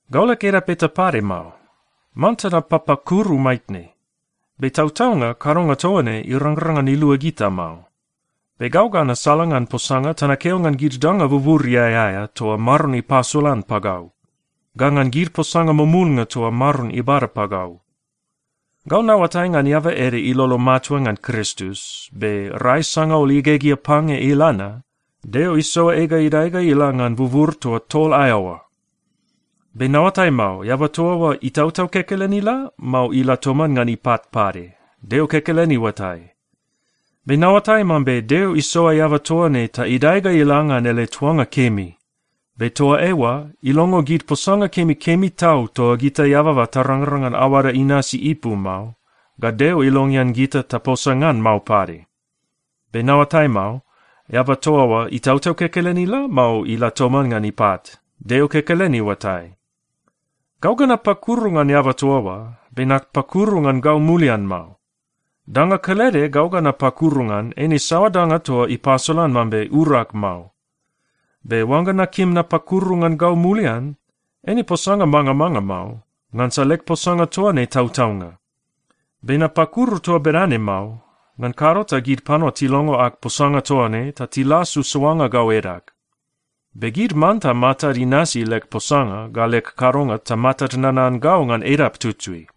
Gau leg edap eta pade mao. Manta napapakuru maitne. Be tautaunga kadonga toa ne irangrang ngan ilua gita mao. Be gau ga nasalangan posanga ta nakeo ngan gid danga buburiai aea toa Maron ipasolan pagau, ga ngan gid posanga mumulnga toa Maron ibada pagau. Gau naoatai ngan eaba ede ilolo matua ngan Kristus. Be rai sangaul igegea pange ila na, Deo isoa ei ga idae ga ila ngan bubur toa tol aea oa. Be naoatai mao, eaba toa oa itautau kekelen ila, mao ila toman ngan ipat pade? Deo kekelen iuatai. Be naoatai mambe Deo isoa eaba toa ne ta idae ga ila ngan ele tuanga kemi. Be toa eoa ilongo gid posanga kemikemi tau toa gita eababa tarangrang ngan aoada inasi ipu mao, ga Deo ilongean gita taposa ngan mao pade. (Be naoatai mao, eaba toa oa itautau kekelen ila, mao ila toman ngan ipat? Deo kekelen iuatai.) Gau ga napakuru ngan eaba toa oa, be napakuru ngan gau mulian mao. Danga kelede gau ga napakuru ngan, eine saoa danga toa ipasolan mambe urag mao. Be oangga nakim napakuru ngan gau mulian, eine posanga mangamanga mao, ngansa leg posanga toa ne tautaunga. Be napakuru toa bedane mao, ngan kado ta gid panua tilongo ag posanga toa ne ta tilasu soanga gau edag. Be gid manta matad inasi leg posanga ga leg kadonga ta matad nanan gau ngan edap tutui.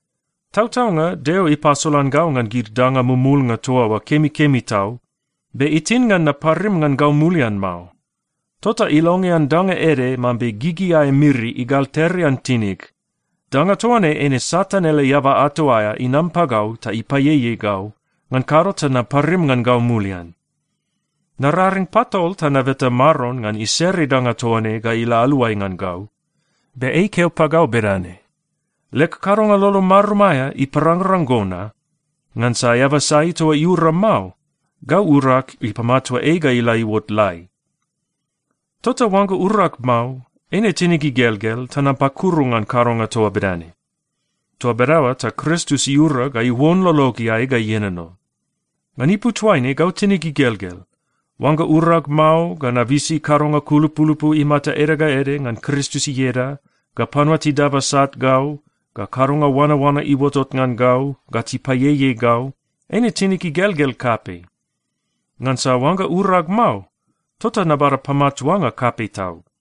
Tautaunga Deo ipasolan gau ngan gid danga mumulnga toa oa kemikemi tau. Be itin ngan naparim ngan gau mulian mao. Tota ilongean danga ede mambe gigi aea miri igalterterean tinig. Danga toa ne eine Satan ele eaba ato aea inam pagau ta ipaieiei gau, ngan kado ta naparim ngan gau mulian. Nararing patol ta nabeta Maron ngan isere danga toa ne ga ila aluai ngan gau. Be ei ikeo pagau bedane, “Leg kadonga lolo marum aea iparangrang go na, ngansa eaba sai toa iura mao, gau urag ipamatua ei ga ila iuot lai.” Tota oangga urag mao, eine tinig igelgel ta napakuru ngan kadonga toa bedane. Toa bedaoa ta Kristus iura ga iuon lologeai ga ienono. Ngan ipu toaine, gau tinig igelgel. Oangga urag mao, ga nabisi kadonga kulupulupu imata ede ga ede ngan Kristus ieda, ga panua tidaba sat gau, ga kadonga oanaoana iuotot ngan gau, ga tipaieiei gau, eine tinig igelgel kapei. Ngansa oangga urag mao, tota nabada pamatuanga kapei tau.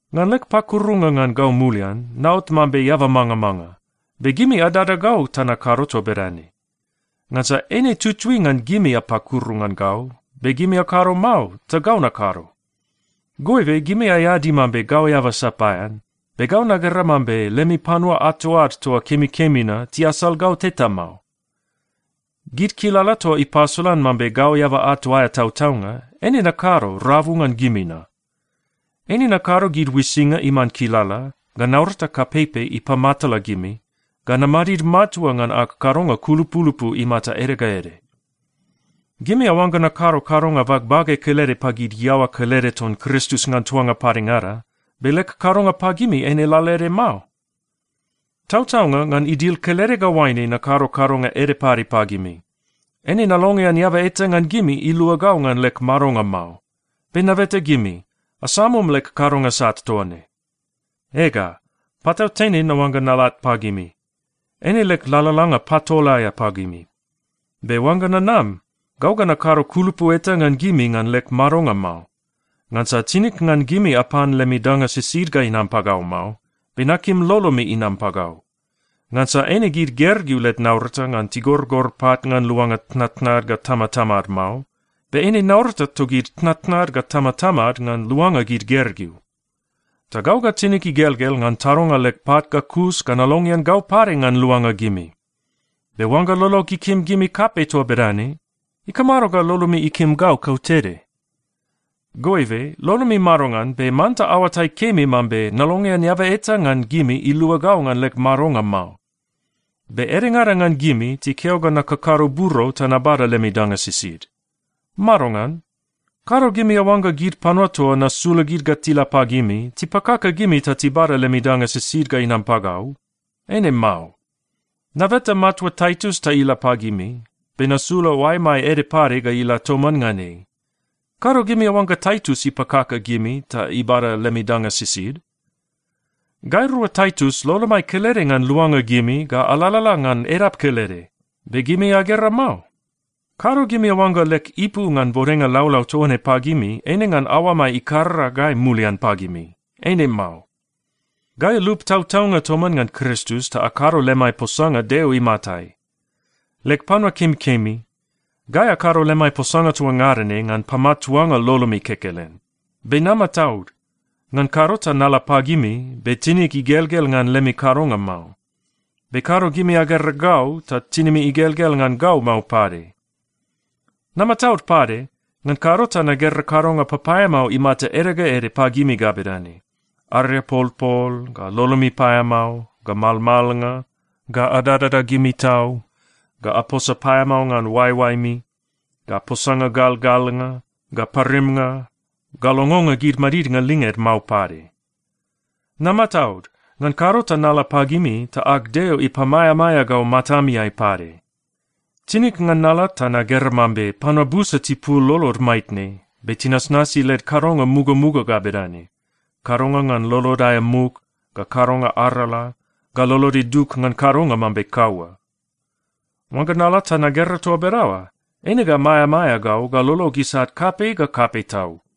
Ngan leg pakurunga ngan gau mulian, naot mambe eaba mangamanga. Be gimi adada gau ta nakado toa bedane. Ngansa eine tutui ngan gimi apakuru ngan gau, be gimi akado mao, ta gau nakado. Goibe, gimi aeadi mambe gau eaba sapaean, be gau nagera mambe lemi panua ato ad toa kemikemi na tiasal gau teta mao. Gid kilala toa ipasolan mambe gau eaba ato aea tautaunga, eine nakado rabu ngan gimi na. Eine nakado gid uisinga iman kilala, ga naurata kapeipei ipamatala gimi, ga namadid matua ngan ag kadonga kulupulupu imata ede ga ede. Gimi aoangga nakado kadonga bagbage kelede pagid iaoa kelede ton Kristus ngan tuanga padengada, be leg kadonga pagimi eine lalaede mao? Tautaunga, ngan idil kelede ga oaine nakado kadonga ede pade pagimi. Eine nalongean eaba eta ngan gimi ilua gau ngan leg madonga mao. Be nabeta gimi, asamum leg kadonga sat toa ne! Ega, patautene naoangga nalat pagimi. Eine leg lalalanga patol aea pagimi. Be oangga nanam, gau ga nakado kulupu eta ngan gimi ngan leg madonga mao. Ngansa tinig ngan gimi apan lemi danga sisid ga inam pagau mao. Be nakim lolomi inam pagau. Ngansa eine gid gergeu led naurata ngan tigorgor pat ngan luanga tnatnad ga tamatamad mao. Be eine naurata togid tnatnad ga tamatamad ngan luanga gid gergeu. Ta gau ga tinig igelgel ngan tadonga leg pat ga kus ga nalongean gau pade ngan luanga gimi. Be oangga lolog ikim gimi kapei toa bedane, ikamado ga lolomi ikim gau kautede? Goibe lolomi madongan, be manta aoatai kemi mambe nalongean eaba eta ngan gimi ilua gau ngan leg madonga mao. Be edengada ngan gimi tikeo ga nakakado buro ta nabada lemi danga sisid. Madongan? Kado gimi aoangga gid panua toa nasula gid ga tila pagimi, tipakaka gimi ta tibada lemi danga sisid ga inam pagau? Eine mao. Nabeta matua Taitus ta ila pagimi, be nasula oaemai ede pade ga ila toman ngan ei. Kado gimi aoangga Taitus ipakaka gimi ta ibada lemi danga sisid? Gairua Taitus lolomai kelede ngan luanga gimi ga alalala ngan edap kelede, be gimi agera mao? Kado gimi aoangga leg ipu ngan bodenga laulau toa ne pagimi eine ngan aoamai ikarara gai mulian pagimi? Eine mao. Gai alup tautaunga toman ngan Kristus ta akado lemai posanga Deo imatai. Leg panua kemikemi, gai akado lemai posanga toa ngada ne ngan pamatuanga lolomi kekelen. Be namataud. Ngan kado ta nala pagimi, be tinig igelgel ngan lemi kadonga mao. Be kado gimi agera gau, ta tinimi igelgel ngan gau mao pade. Namataud pade, ngan kado ta nagera kadonga papaeamao imata ede ga ede pagimi ga bedane: ariapolpol, ga lolomi paeamao, ga malmalnga, ga adadada gimi tau, ga aposa paeamao ngan oaeoaemi, ga posanga galgalnga, ga parimnga, ga longonga gid madidnga linged mao pade. Namataud, ngan kado ta nala pagimi ta ag Deo ipamaeamaea gau matamiai pade. Tinig ngan nala ta nagera mambe panua busa tipul lolod maitne, be tinasnasi led kadonga mugamuga ga bedane: kadonga ngan lolod aea muk, ga kadonga arala, ga lolod idug ngan kadonga mambe kaua. Oangga nala ta nagera toa bedaoa, eine ga maeamaea gau ga lolog isat kapei ga kapei tau.